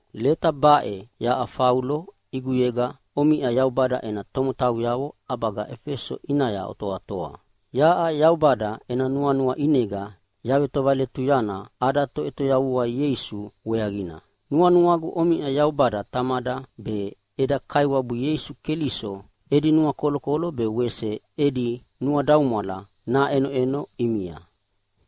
Leta baʼe yaʼa Faulo ʼiguyega omiʼa Yaubada ena tomotauyavo ʼabaga Efeso ʼinaya otoatoa. Yaʼa Yaubada ena nuanua ʼinega yavetovaletuyana ada Toʼetoyavua Ieisu weaqina. Nuanuagu omiʼa Yaubada Tamada be eda Kaiwabu Ieisu Keliso edi nuakolokolo be wese edi nuadaumwala naʼenoʼeno ʼimia.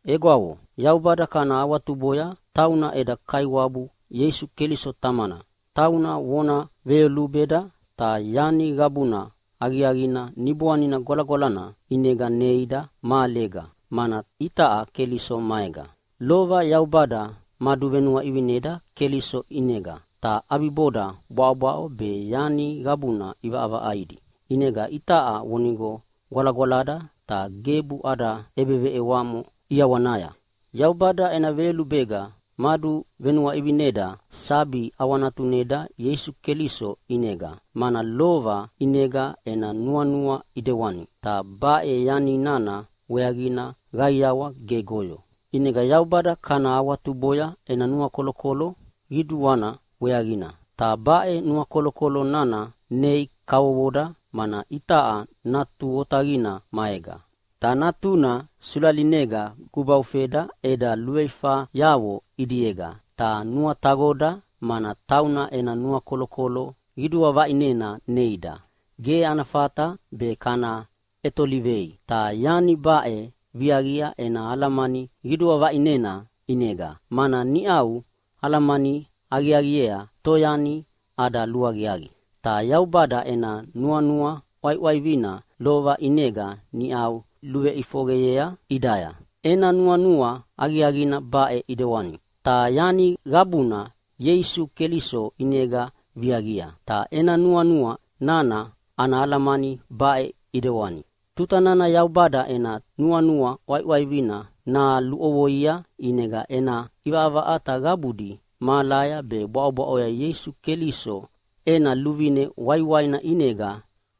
Egwavo, Yaubada kana awatuboya, tauna eda Kaiwabu Ieisu Keliso Tamana. Tauna vona veyolubeda ta yani qabuna aqiaqina Niboanina Gwalagwalana ʼinega neida mahalega, mana itaʼa Keliso maega. Lova Yaubada maduvenuaʼivineda Keliso ʼinega, ta ʼabiboda bwaʼobwaʼo be yani qabuna ʼivaʼavaʼaidi. ʼInega itaʼa vonigo gwalagwalada ta gebu ada ʼebeveʼewamo ʼiawanaya. Yaubada ena veyolubega maduvenuaʼivineda sabi ʼawanatuneda Ieisu Keliso ʼinega, mana lova ʼinega ena nuanua ʼidewani, ta baʼe yani nana weaqina qaiawa gegoyo. ʼInega Yaubada kana awatuboya ena nuakolokolo qiduana weaqina, ta baʼe nuakolokolo nana nei kavovoda, mana itaʼa Natu Otaqina maega. Ta Natuna sulalinega gubaufeda eda luveifayavo ʼidiega ta nuataqoda, mana tauna ena nuakolokolo qidua vaʼinena neida, ge ana fata be kana ʼetolivei. Ta yani baʼe viaqia ena alamani qidua vaʼinena ʼinega, mana niʼau alamani aqiaqiea toyani ada luaqiaqi. Ta Yaubada ena nuanua ʼwaiʼwaivina lova ʼinega niʼau luʼifoqeyea ʼidaya. Ena nuanua aqiaqina baʼe ʼidewani, ta yani qabuna Ieisu Keliso ʼinega viaqia. Ta ena nuanua nana ana alamani baʼe ʼidewani: Tuta nana Yaubada ena nuanua ʼwaiʼwaivina naluʼovoia ʼinega ena ʼivaʼavaʼata qabudi mahalaya be bwaʼobwaʼoya Ieisu Keliso ena luvine waiwaina ʼinega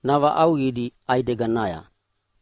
navaʼauqidi ʼaideganaya.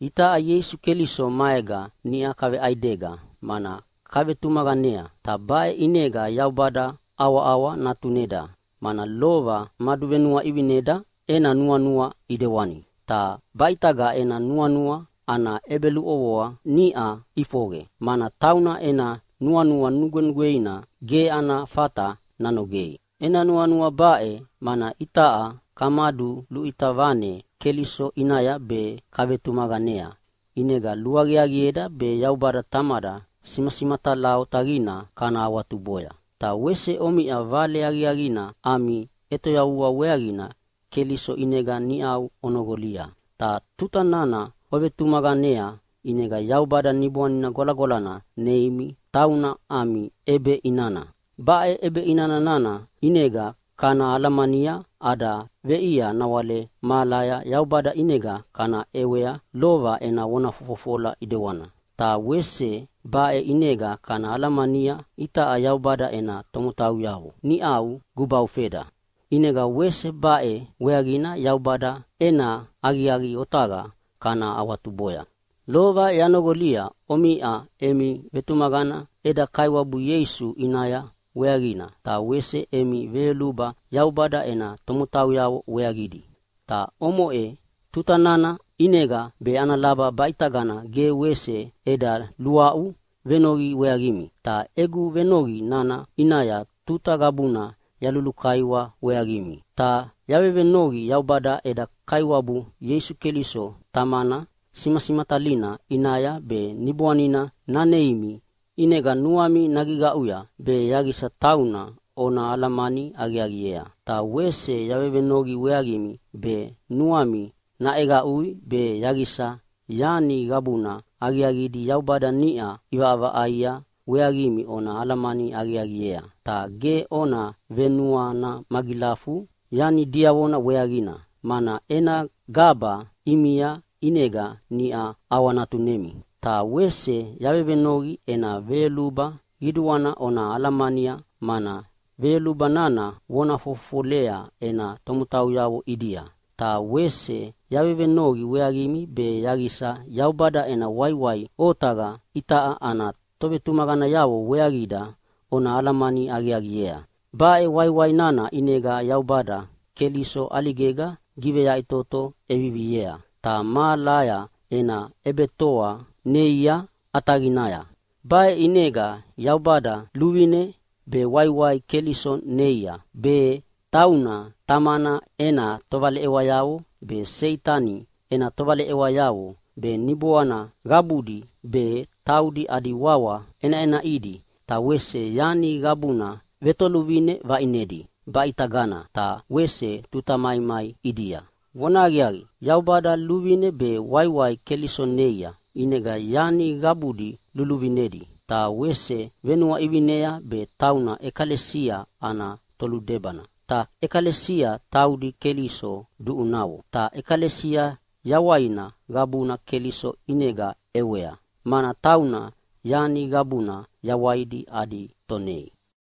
Itaʼa Ieisu Keliso maega niʼa kaveʼaidega mana kavetumaqanea. Ta baʼe ʼinega Yaubada ʼawaʼawa natuneda, mana lova maduvenuaʼivineda ena nuanua ʼidewani. Ta baʼitaga ena nuanua ana ʼebeluʼovoa niʼa ʼifoqe, mana tauna ena nuanua nugwenugweina ge ana fata nanogei. Ena nuanua baʼe mana itaʼa kamaduluʼita vane Keliso ʼinaya be kavetumaqanea, ʼinega luaqiaqieda be Yaubada Tamada simasimatala otaqina kana awatuboya. Ta wese omiʼa Vale Aqiaqina ami ʼetoyavua weaqina Keliso ʼinega niʼau onoqolia. Ta tuta nana ovetumaqanea ʼinega Yaubada Niboanina Gwalagwalana neimi, tauna ami ʼebeʼinana. Baʼe ʼebeʼina nana ʼinega kana alamania ada veʼia nawale mahalaya Yaubada ʼinega kana ʼewea lova ena vona fofofola ʼidewana. Ta wese baʼe ʼinega kana alamania itaʼa Yaubada ena tomotauyavo niʼau gubaufeda. ʼInega wese baʼe weaqina Yaubada ena aqiaqi otaqa kana awatuboya. Lova yanoqolia omiʼa emi vetumaqana eda Kaiwabu Ieisu ʼinaya weaqina, ta wese emi veyoluba Yaubada ena tomotauyavo weaqidi. Ta omoʼe tuta nana ʼinega be ana laba baʼitagana ge wese eda luaʼu venoqi weaqimi. Ta egu venoqi nana ʼinaya tuta qabuna yalulukaiwa weaqimi. Ta yavevenoqi Yaubada eda Kaiwabu Ieisu Keliso Tamana simasimatalina ʼinaya be Niboanina naneimi ʼinega nuami nagiqaʼuya, be yaqisa tauna ona alamani aqiaqiea. Ta wese yavevenoqi weaqimi be nuami naʼeqaʼui be yaqisa yani qabuna aqiaqidi Yaubada niʼa ʼivaʼavaʼaia weaqimi ona alamani aqiaqiea. Ta ge ona venuana magilafu yani diavona weaqina, mana ena gaba ʼimia ʼinega niʼa ʼawanatunemi. Ta wese yavevenoqi ena veyoluba qiduana ona alamania, mana veyoluba nana vona fofofolea ena tomotauyavo ʼidia. Ta wese yavevenoqi weaqimi be yaqisa Yaubada ena waiwai otaqa itaʼa ana tovetumaqanayavo weaqida ona alamani aqiaqiea. Baʼe waiwai nana ʼinega Yaubada Keliso ʼaligega giveyaʼitoto ʼeviviea, ta mahalaya ena ʼebetoa neia ʼataqinaya. Baʼe ʼinega Yaubada luvine be waiwai Keliso neia, be tauna Tamana ena tovaleʼewayavo be, Seitani ena tovaleʼewayavo be, niboana qabudi be, taudi adi wawa ʼenaʼenaʼidi, ta wese yani qabuna vetoluvine vaʼinedi baʼitagana ta wese tuta maimai ʼidia. Vonahaqiaqi, Yaubada luvine be waiwai Keliso neia, ʼinega yani qabudi luviluvinedi, ta wese venuaʼivinea be tauna ʼekalesia ana toludebana. Ta ʼekalesia taudi Keliso duʼunavo. Ta ʼekalesia yawaina qabuna Keliso ʼinega ʼewea, mana tauna yani qabuna yawaidi adi Tonei.